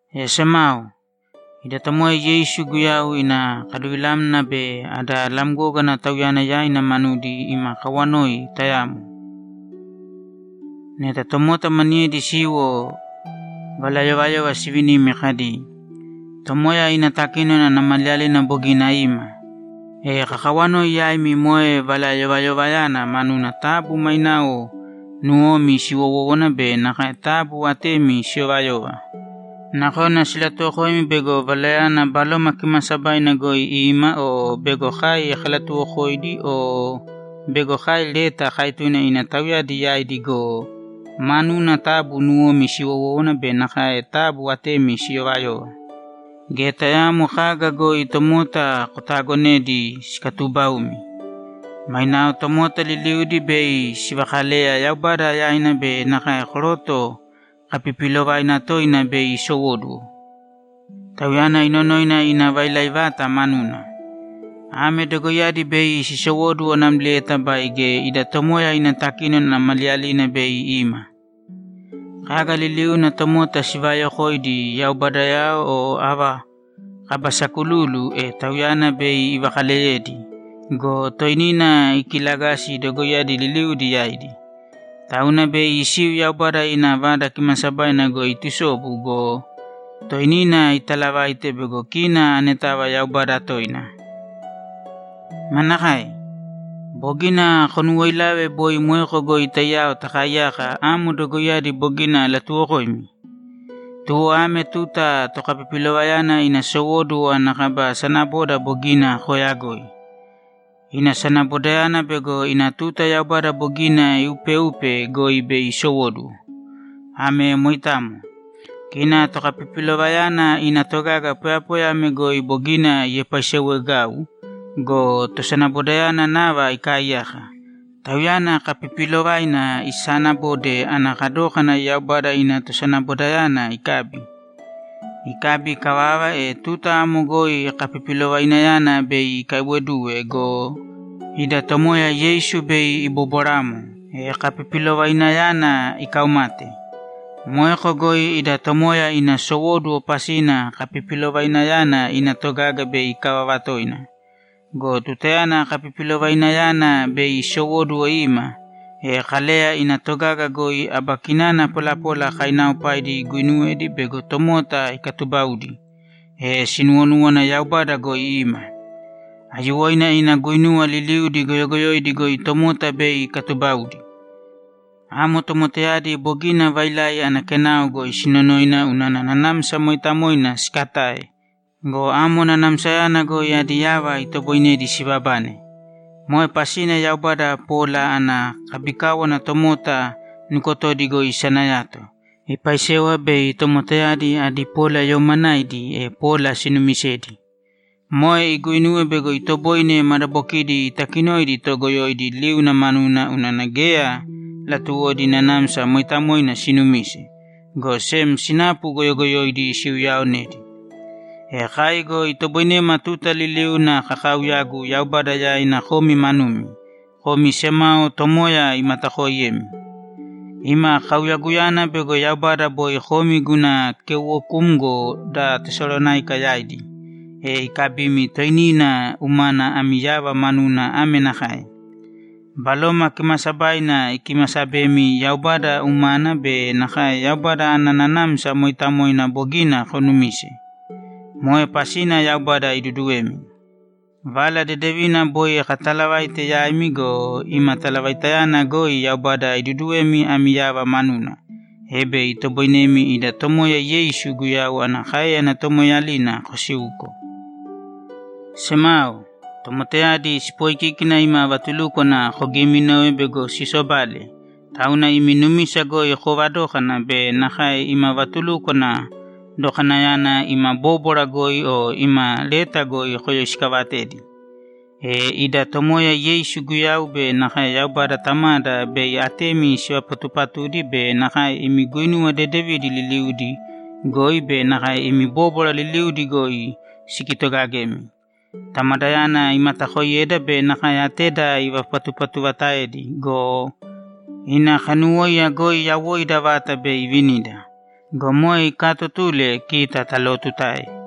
E semao, ida Tomoya Yeisu Guyau ina kaluvilamna be ada lamgógana Tauyana yaina manudi ima kawanoi tayamo. Neta tomota maniyedi siwo valayovayova sivinimi kadi, ‘Tomoya ina takínona ana maliyalina bogina ima’, e kakawanoi yaimi moe valayovayovayana manuna taabu mainao nuwomi siwowōwana be nakae taabu atemi siyovayōva. Nakona silatuwokoimi bego valayana Baloma Kimaasabaina goi ima o bego kai kalatuwokoidi o bego kai leta kaetune ina tauyadi yaidi go, manuna taabu nuwomi siwowōwana be nakae taabu atemi siyovayōva. Geya tayaamo kaga goi tomota kotaagonēdi sikatuubaumi. Mainao tomota liliudi bei sivakaleya Yaubada yaina be nakae koroto kapipiilovaina toina bei isowóduwo, tauyana inonoina ina vailai vata manuna. Ame dogoiyadi bei sisowóduwo namlieta baige ida Tomoya ina takínona ana maliyalina bei ima. Kaga liliuna tomota sivaayokoidi yaubadao o ava kaba sakululu, e tauyana bei ivakaaleyedi go, toinina ikilagasi dogoiyadi liliudi yaidi. Tauna bei isiu Yaubada ina Vada Kimaasabaina goi itusobu go, toinina italavaite bego kina anetava Yaubada toina. Manakae? Bogina konuwoilave boi moeko goi taiyao takaaiyaka amo dogoiyadi bogina alatuwokoimi? Tuwo ame tuta tokapipilovayana ina sowóduwo ana kaba sanaboda bogina kooyagoi. Ina sanabodayana bego ina tuta Yaubada bogina iupeupe goi bei isowóduwo. Ame moitamo. Kina tokapipilovayana ina togaga poyapoya ame goi bogina iepaiseewegau go, tosanabodayana nava ikaaiyaka, tauyana kapipiilovaina isaanabode ana kadókana Yaubada ima tosanabodayana ikabi. Ikabi ikavava, e tuta amo goi kapipilovainayana bei ikaiwoduwe go, ida Tomoya Yeisu bei ibobwaramo, e kapipilovainayana ikaumate. Moeko goi ida Tomoya ina sowóduwo pasina kapipilovainayana ina togaga bei ikavava toina. Go tutayana kapipilovainayana bei isowóduwo ima, e Kaleya ina togaga goi aba kinana polapola kainaaopaidi iguinuwedi bego tomota ikatubaudi, e sinuwonúwana Yaubada goi ima. Aiyuwoina ina guinuwa liliudi goyogoyoidi goi tomota bei ikatubaudi. Amo tomotayadi bogina vailai ana kenao goi sinonoina unana Nanamsa Mooitamoina sikatae go, amo Nanamsayana goi adi yava itoboinedi sibabane! Moe pasina Yaubada pola ana kabikáwana tomota nukotodi goi isanayato, ipaisewa bei tomotayadi adi polayoomanaidi, e pola sinuumisedi. Moe iguinuwe bego itoboine madabokidi itakinoidi toogoyoidi liuna manuna unana geya latuwodi Nanamsa Mooitamoina sinumise, go sem sinapu goyogoyoidi siuyaaonedi. E kai go itoboinema tuta liliuna kakaauyagu Yaubada yaina komi manumi, komi semao Tomoya imatakooiyemi. Ima kauyaguyana bego Yaubada boi komi guna keuwokumgo da Tesalonáika yaidi, e ikabimi toinina umana ami yava manuna ame nakae: Baloma Kimaasabaina ikimasabemi Yaubada umana be nakae Yaubada ana Nanamsa Mooitamoina bogina konumise. Moe pasina Yaubada iduduwemi. Vala Dedevina boi katalavaite yaimi go, ima talavaitayana goi Yaubada iduduwemi ami yava manuna, e bei itoboinemi ida Tomoya Yeisu Guyau ana káeyana tomoeeyalina kosiuko. Semao, tomotayadi sipooikíkina ima vatulúkwana kogiiminove bego sisobale, tauna imi numisa goi koovadōkana be nakae ima vatulukwana dokanayana ima bóbwara goi o ima leta goi koyoisikaavatēdi. E ida Tomoya Yeisu Guyau be nakae Yaubada Tamada bei atemi sivapatupatudi be nakae imi guinuwa dedevidi liliudi goi be nakae imi bóbwara liliudi goi sikitogagemi. Tamadayana imatakoiyeda be nakae ateda ivapatupatuvataedi go, ina kanuwóiya goi yawoida vata bei ivinida. Go moe ikaatotule kita talootutae.